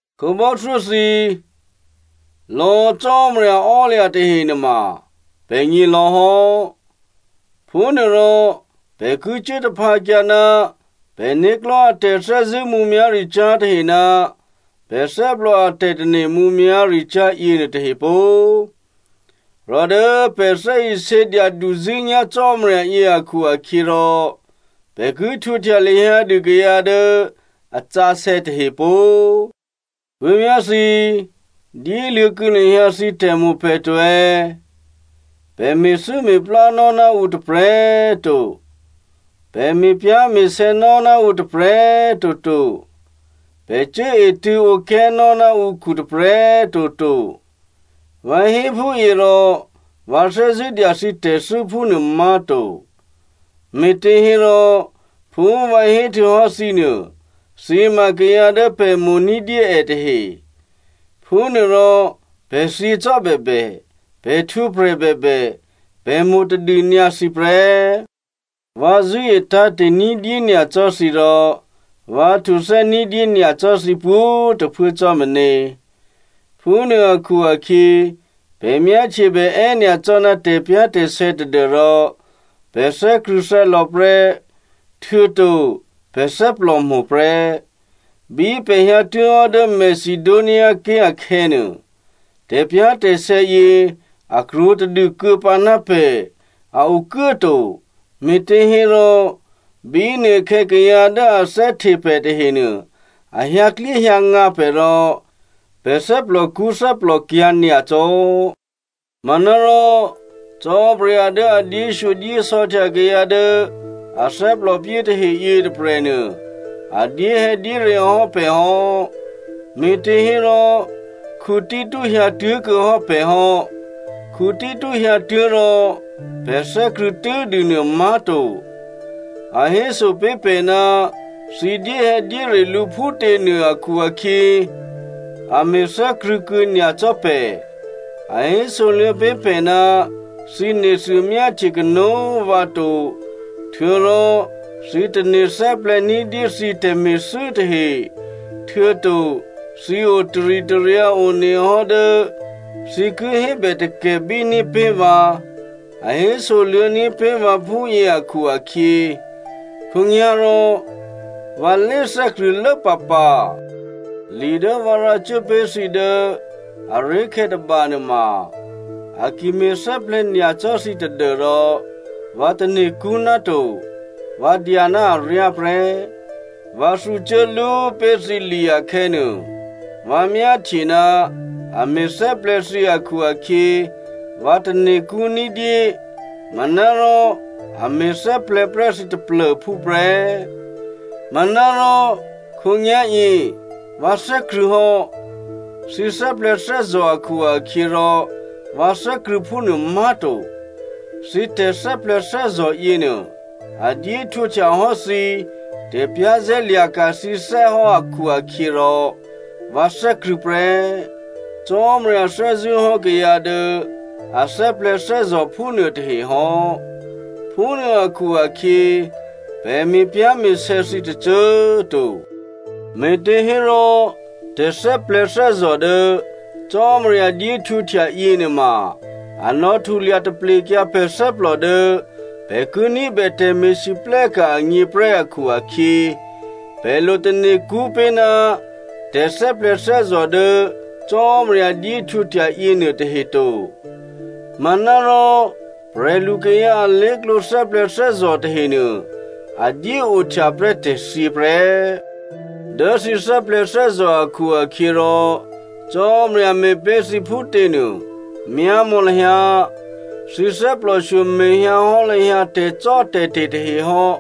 Khǒbò́thyó thǐ꤮ lò̌ Cò́marya ò́lya̤ tahe nuôma pè̤gně lò̌ hò́. Phúnuôrò, pè̤ ki cuố taphǎkyǎ ná pè̤né̤klò̤́ a tè̤thè́zṳ̂́ mǔmyá̤ricyá̤ tahe ná pè̤ thè́plò a tè̤tane̤ mǔmyá̤ricyá̤ yěnuô tahe pó꤮. Rò dố pè̤ thè́isě dyaduzṳ̂́nyá̤ Cò́marya yě akhu-akhyěrò pè̤ ki htwǒhtya lahyǎ dû kayǎ dố a sǎsè̌ tahe pó꤮. Puố̤vyá̤ thǐ꤮, dyéluô̌kuô̌ lahyǎ thǐ tè̤mo̤ pè̤ to꤮. Pè̤ me̤thû́me̤plánò́ ná ǔ tôprè̤꤮ to. Pè̤ me̤pyá̤me̤sè̌nò́ ná ǔ tôprè̤꤮ toto. Pè̤ cuốetṳ̂̌ǒplè nò́ ná ǔkhu tôprè̤꤮ toto. Vǎ hé phúyě rò vǎ thè́zṳ̂́ dya thǐ tè̤thû́ phúnuô má̤to. Me̤těhérò phú vǎ héhtuô̌hò́ thǐ nuô, thǐ ma kayǎ dố pè̤ mo̤ ní̤dyé è tahe. Phúnuôrò pè̤ thyě cò́bèbè, pè̤ htwǒprè̤ bèbè, pè̤ mo̤tadû nyǎ thǐ prè́. Vǎ zṳ̂́e tǎ̤te̤ ní̤dyé nyacò́ thǐ rò vǎ htuthè́ ní̤dyé nyacò́ thǐ pwǒ̤꤮ tôphuố cò́ meně. Phúnuô akhu-akhyě pè̤ myáhtyebè è́nyacò́ ná tè̤pyá̤tè̤sè̌ tadû́rò pè̤ thè́krṳ̂̌thè́lò̌ prè́, htuô̌to pè̤ thè́plòmo̤ prè́. Bí pè̤ hyǎtuố̤hò́ dố Macedoniaké̤ akhè̌nuô, tè̤pyá̤tè̤sè̌ yě a krwǒtadû kuô̌pǎ ná pè̤, a okuốto, me̤těhérò bínuôkhè̌ kayǎ dố a thè́hte pè̤ tahenuô a hyǎklyéhyǎngǎ pè̤ rò pè̤ thè́plòkṳ́ thè́plòkyǎ̤ nyacò́. Manárò Cò́marya dố a dyéshyodyésò̌htya kayǎ dố a thè́plòpyé tahe yětôprè̤nuô, a dyéhè̌dyére hò́ pè̤ hò́, me̤těhérò Tito hyǎtuố̤kuô̌ hò́ pè̤ hò́. Tito hyǎtuố̤ rò pè̤ thè́krṳ̂̌ tû́dûnuô má̤to, a héso pé̤ pè̤ ná thǐ dyéhè̌dyére lǔ phútě nuô akhu-akhyě a me̤thè́krṳ̂̌ kuô̌ nyacò́ pè̤. A hésoluô̌ pé̤ pè̤ ná thǐ nethuô myáhtye kanó̤ vǎ to, htuô̌rò thǐ tane̤thè́plè̤̌ ní̤dyé thǐ tè̤me̤thû́ tahe, htuô̌to thǐ o taritaryǎ onehò́ dố thǐ ki hébè takè̤bíní̤ pé̤ vǎ, a hésoluô̌ní̤ pé̤ vǎ phúyě akhu-akhyě, khǒnyá̤rò vǎ lé thè́krṳ̂̌lố pǎpǎ. Li dố vǎ rǎcuố pé̤ thǐ dố aré̤khè̌ tôbanuôma, a ki me̤thè́plè̤̌ nyacò́ thǐ tadû́rò vǎ tane̤kṳ́ ná to, vǎ dya ná aryá prè́. Vǎ thǔcuố lú pé̤ thǐ li akhè̌nuô, vǎ myáhtye ná a me̤thè́plè̤̌ thǐ akhu-akhyě, vǎ tane̤kṳ́ ní̤dyé, manárò a me̤thè́plè̤̌ prè́ thǐ taplô̤phú prè́. Manárò khǒnyá̤yě, vǎ thè́krṳ̂̌ hò́. Thǐ thè́plè̤̌thè́zò̤ akhu-akhyěrò vǎ thè́krṳ̂̌ phúnuô má̤to. Thǐ tè̤thè́plè̤̌thè́zò̤ yěnuô, a dyéhtwǒhtya hò́ thǐ tè̤za̤ lya̤ní̤dû thǐné̤ hò́ akhu-akhyěrò vǎ thè́krṳ̂̌ prè́. Cò́marya thè́zṳ̂́hò́ kayǎ dố a thè́plè̤̌thè́zò̤ phúnuô tahe hò́. Phúnuô akhu-akhyě pè̤ me̤pyá̤me̤sè̌ thǐ tôcô꤮ to. Me̤těhérò, tè̤thè́plè̤̌thè́zò̤ dố Cò́marya dyéhtwǒhtya yěnuôma, a nò̌ htulya taplekyǎ pè̤ thè́plò dố pè̤ ki ní̤bè tè̤me̤lwóhteka̤ agně prè́ akhu-akhyě, pè̤ lo tane̤kṳ́ pé̤ ná tè̤thè́plè̤̌thè́zò̤ dố Cò́marya dyéhtwǒhtya yěnuôtahe to. Manárò prè̤lukayǎ alé̤klǒ thè́plè̤̌thè́zò̤ tahenuô, a dyéohtya prè́ tè̤thyě prè́. Dố thǐ thè́plè̤̌thè́zò̤ akhu-akhyěrò Cò́marya me̤pé̤ thǐ phútě nuô, myámò̌ lahyǎ! Thǐ thè́plòshyo me̤hyǎhò́ lahyǎ tè̤cò́tè̤te̤ tahe hò́,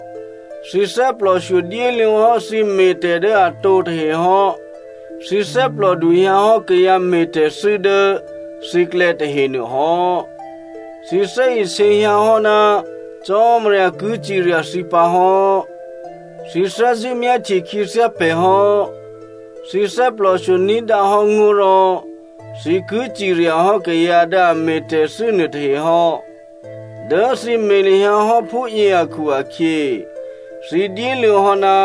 thǐ thè́plòshyo dyéluô̌ hò́ thǐ me̤tè̤ dố atǒ tahe hò́. Thǐ thè́plòdu hyǎhò́ kayǎ me̤tè̤thû́ dố thǐklè̌ tahenuô hò́, thǐ thè́isě hyǎhò́ ná Cò́marya ki cirya thǐ pǎ hò́. Thǐ thè́zṳ̂́ myáhtye khyěthyá pè̤ hò́. Thǐ thè́plòshyo ní̤dǎhò́ ngó̤ rò thǐ ki ciryahò́ kayǎ dố a me̤thû́tè̤ nuôtahe hò́. Dố thǐ me̤ lahyǎ hò́ phúyě akhu-akhyě, thǐ dyéluô̌ hò́ ná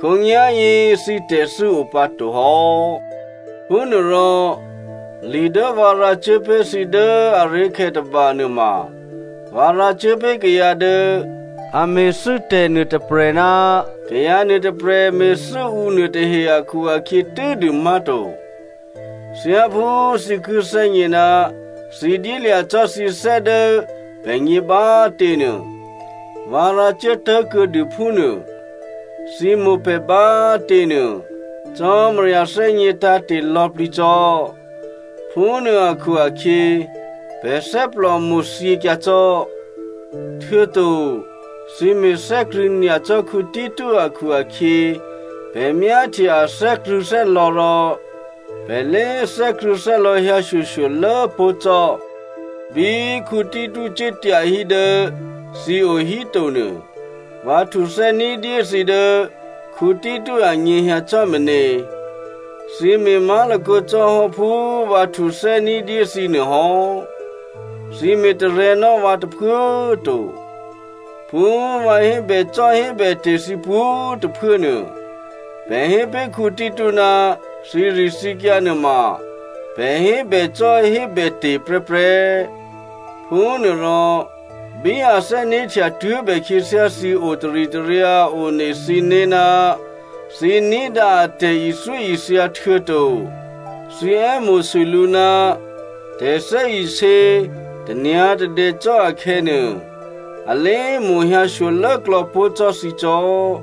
khǒnyá̤yě thǐ tè̤thû́ o pǎto hò́. Phúnuôrò, li dố vǎ rǎcuốpé̤ thǐ dố aré̤khè̌ tôbanuô ma, vǎ rǎcuố pé̤ kayǎ dố a me̤thû́tè̤ nuôtôprè̤ ná kayǎ nuôtôprè̤ me̤thû́ǔ nuôtahe akhu-akhyě tû́dû má̤to, thyáphú thǐ ki thè́gně ná thǐ dyélya̤ cò́ thǐthè́ dố pè̤gně bá꤮ těnuô, vǎ rǎcuố tố̤kuô̌dû phúnuô. Thǐ mo̤ pè̤ bá꤮ těnuô Cò́marya thè́gně tǎ̤te̤ lò̌plǐ cò́. Phúnuô akhu-akhyě, pè̤ thè́plòmo̤ thyěkyǎ cò́. Htuô̌to thǐ me̤thè́krṳ̂̌ nyacò́ Tito akhu-akhyě, pè̤ myáhtye a thè́krṳ̂̌thè́lò̌ rò pè̤ lé thè́krṳ̂̌thè́lò̌ hyǎshyoshyolố pó̤ cò́. Bí Tito cuố tyahí dố thǐ o híto nuô, vǎ htuthè́ ní̤dyé thǐ dố Tito anyěhyǎ cò́ meně. Thǐ me̤ má̤lakǒ cò́ hò́ phú vǎ htuthè́ ní̤dyé thǐ nuô hò́. Thǐ me̤tarè̤̌nò́ vǎ tôphuố꤮ to. Phú vǎ hébècò́hébète̤ thǐ pwǒ̤꤮ tôphuố nuô, pè̤ hé pé̤ Tito ná thǐrithǐkyǎ nuôma pè̤ hébècò́hébète̤ prè́prè́. Phúnuôrò, bí a thè́né̤htya tuố̤bè khyěthyá thǐ o taritaryǎ one thǐné̤ ná thǐ ní̤dǎ a tè̤ithyóithya htuô̌to thǐ è́mo̤sû lǔ ná tè̤thè́isě, tanyǎ̤tadè cò́ akhè̌nuô, a lé mo̤hyǎ shyolốklò̌ pó̤ cò́ thǐ cò́.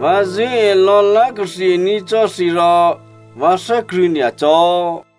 Vǎ zṳ̂́e lò̌lá̤kathe ní̤ cò́ thǐ rò vǎ thè́krṳ̂̌ nyacò́.